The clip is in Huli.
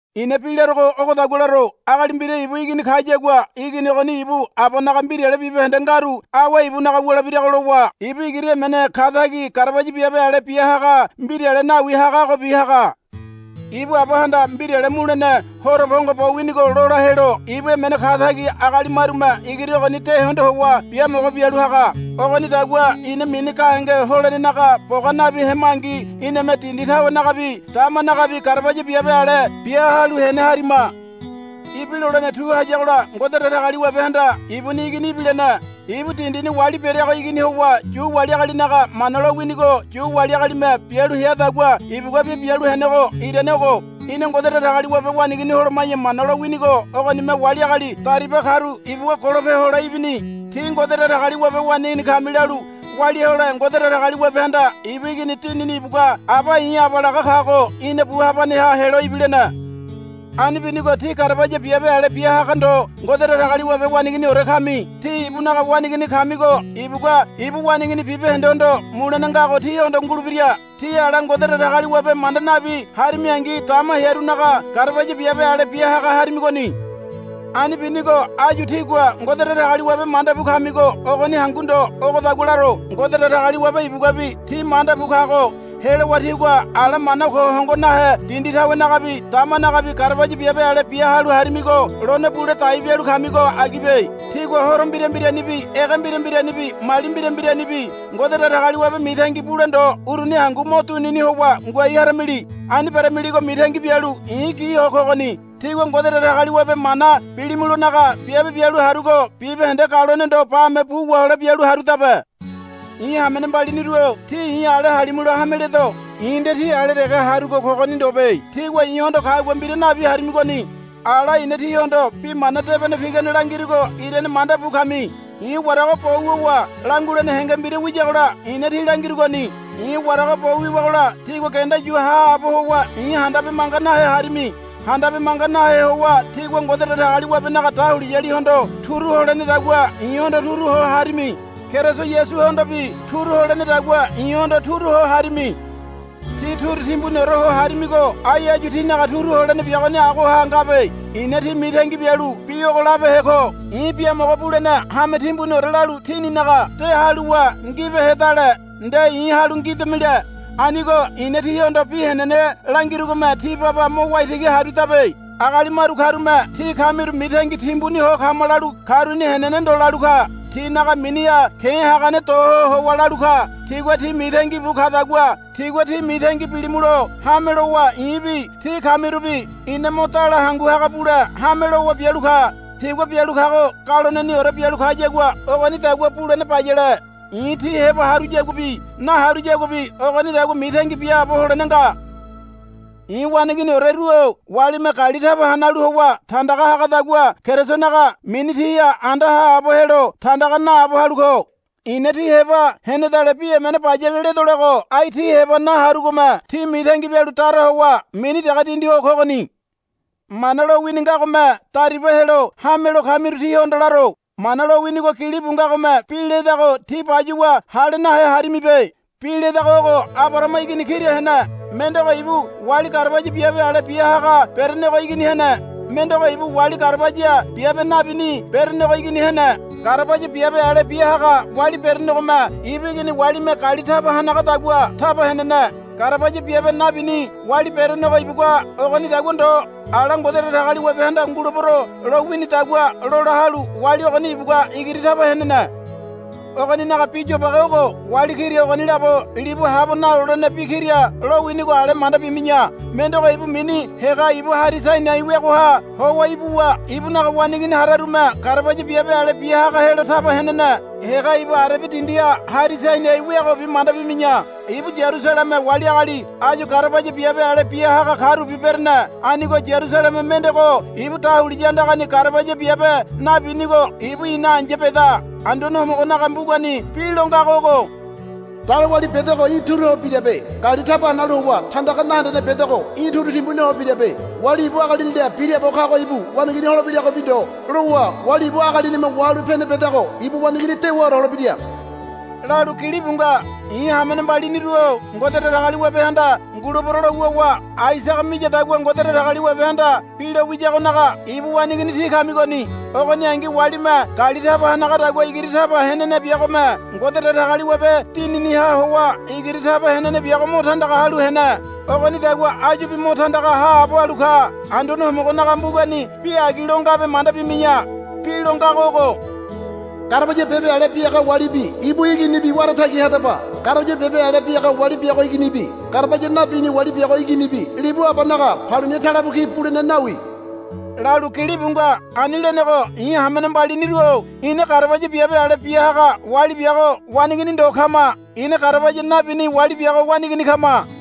I̱na bi larogo ogodagua laro. Agali mbira ibu igini kayagua igini ogoni ibu abanaga mbirale bibahende ngaru awe ibunaga wulebirago lowa ibu igiri emene katagi garabaya biabe ale bia haga mbirale nawi hagagobi haga. Ibu abahanda mbirale mulene horo pongo bo winigo lola helo ibu emene katagi agali marume igiri ogoni de hondo howa biamogo bialu haga. Ogonidagua ina mini gahenge holenenaga boga nabi hemangi iname dindi tawenagabi damanagabi garabaya biabe ale bia halu hene harima. Ibilolene tu hayagola Ngode Datagaliwabehanda ibuni Igini ibilene. Ibu dindini wali bereago igini howa Yu wali agalinaga Mana lowinigo Yu wali agalime bialu headagua ibuguabi bialu henego irane ogo. Ina Ngode Datagaliwabe waneigini holoma̱ya Mana lowinigo ogonime wali agali dariba karu ibugua golope hole ibini. Tí Ngode Datagaliwabe waneigini kami lalu walia hole Ngode Datagaliwabehanda ibu Igini Dinini ibugua, Aba i̱ Aba, laga kago ina bu habaneha helo ibilene. Ani binigo tí garabaya biabe ale bia haga ndo Ngode Datagaliwabe waneiginiore kami. Tí ibunaga waneigini kamigo ibugua ibu waneigini bibahendehondo mulene ngago tíhondo ngulebira. Tí ala Ngode Datagaliwabe manda nabi harimingi dama hearunaga garabaya biabe ale bia haga harimigoni. Ani binigo áyu tígua Ngode Datagaliwabe manda bu kamigo ogoni hangu ndo ogodagua laro Ngode Datagaliwabe ibuguabi tí manda bu kago helowa tígua ala mana ko hongo nahe dindi tawenagabi damanagabi garabaya biabe ale bia halu harimigo lone bule dai bialu kamigo agibe. Tígua horo mbira mbiranibi ege mbira mbiranibi mali mbira mbiranibi Ngode Datagaliwabe mitangi bule ndo uruni hangu mo dunini howa ngoai haramili. Ani beramiligo mitangi bialu i̱ gi ho kogoni. Tígua Ngode Datagaliwabe mana bilimulonaga biabe bialu harugo bibahende galone ndo bame bu wahole bialu harudabe. I̱ hamene mbaliniru-o tí i̱ ale halimulo hame ledo. I̱ nde tí ale dege harugo kogoni ndobe. Tígua i̱hondo kagua mbira nabi harimigoni. Ala i̱na tíhondo bi mana debene pigane langirugo irane manda bu kami. I̱ warago bo wuwa langulene henge mbira wiyagola i̱na tí langirugoni. I̱ warago bo wiwagola tígua genda yu haabo howa i̱ handabe manga nahe harimi. Handabe manga nahe howa tígua Ngode Datagaliwabenaga dahuliyalihondo turu holenedagua i̱hondo turu ho harimi. Keriso Yasuhondobi turu holenedagua i̱hondo turu ho harimi. Tí turu timbuniore ho harimigo ai áyu tínaga turu holene biagoni agoha ngabe. I̱na tí mitangi bialu bi ogo labehe ko. I̱ biamogo bulene hame timbuniore lalu tíninaga de haluwa ngibehedale nde i̱ halu ngidamile. Anigo i̱na tíhondo bi henene langirugome tí baba mo waitigi harudabe. Agali maru karume tí kamiru mitangi timbuni ho kama lalu karuni henene ndo lalu ka. Tinaga miniha ke̱ hagane do ho howa lalu ka. Tigua tí mitangi bu kadagua tígua ti mitangi bilimulo hame lowa i̱bi tí kamirubi ina mo dala hangu haga bule hame lowa bialu ka. Tigua bialu kago galoneniore bialu kayagua ogonidagua bulene bayale. I̱ tí heba haruyaguabi naharuyaguabi ogonidagua mitangi biaabo holene nga. I̱ waneiginioreru-o walime gali taba hanalu howa tandaga hagadagua Kerisonaga mini tíha anda haabo helo tandaga naabo halu ko. I̱na tí heba henedale bi emene bayale ledolego ai tí heba naharugome tí mitangi bialu dara howa mini dege dindi ho kogoni. Mana lowini ngagome dariba helo hamelo kamiru tíhondo laro. Mana lowinigo gilibu ngagome bi ledago tí bayuwa hale nahe harimibe. Bi ledago ogo, Abarahama igini kira hene. Mendego ibu wali garabaya biabe ale bia haga berenego igini hene. Mendego ibu wali garabaya biabe nabini berenego igini hene. Garabaya biabe ale bia haga wali berenegome ibu igini walime gali taba hanagadagua taba henene. Garabaya biabe nabini wali berenego ibugua ogonidagua ndo. Ala Ngode Datagaliwabehanda, Ngulebero, lo winidagua lola halu wali ogoni ibugua igiri taba henene. Ogoninaga bi yobage ogo. Wali kira ogoni labo libu habo nalolene bi kira lowinigo ale manda bimi̱ya. Mendego ibu mini Hega ibu Hari Sainai weagoha howa ibuwa ibunaga waneigini hararume garabaya biabe ale bia haga helo taba henene. Hega ibu Arebia dindiha Hari Sainai weagobi manda bimi̱ya. Ibu Yarusaleme wali agali áyu garabaya biabe ale bia haga karubi berene. Anigo Yarusaleme mendego ibu dahuliya andagani garabaya biabe nabinigo ibu ina ai̱ya beda. Anduane Homogonaga mbugani bi lo ngago ogo. Dalo wali bedego í̠ turu ho birabe. Gali taba hanalu howa tandaga nahendene bedego í̠ turu timbuni ho birabe. Wali ibu agalinila biraabo kago ibu waneigini holebiragobi ndo lowa wali ibu agalinime wahalu pene bedago ibu waneigini dewaore holebira, lalu gilibu nga. I̱ hamene mbaliniru-o Ngode Datagaliwabehanda, Ngulebero, lo wuwa Aisaga miyadagua Ngode Datagaliwabehanda bi lo wiyagonaga ibu waneigini tí kamigoni. Ogoningi walime gali taba hanagadagua igiri taba henene biagome Ngode Datagaliwabe Dininiha howa igiri taba henene biago mo tandaga halu hene. Ogonidagua áyubi mo tandaga haabo halu ka. Anduane Homogonaga mbugani bi agi lo ngabe manda bimi̱ya. Bi lo ngago ogo. Garabaya biabe ale bia haga walibi ibu iginibi wara tagi hadaba. Garabaya biabe ale bia haga wali biago iginibi garabaya nabini wali biago iginibi libu abanaga paluni talebu ki bulene nawi, lalu gilibu nga. Ani lenego i̱ hamene mbaliniru-o ina garabaya biabe ale bia haga wali biago waneigini ndo kama. Ina garabaya nabini wali biago waneigini kama.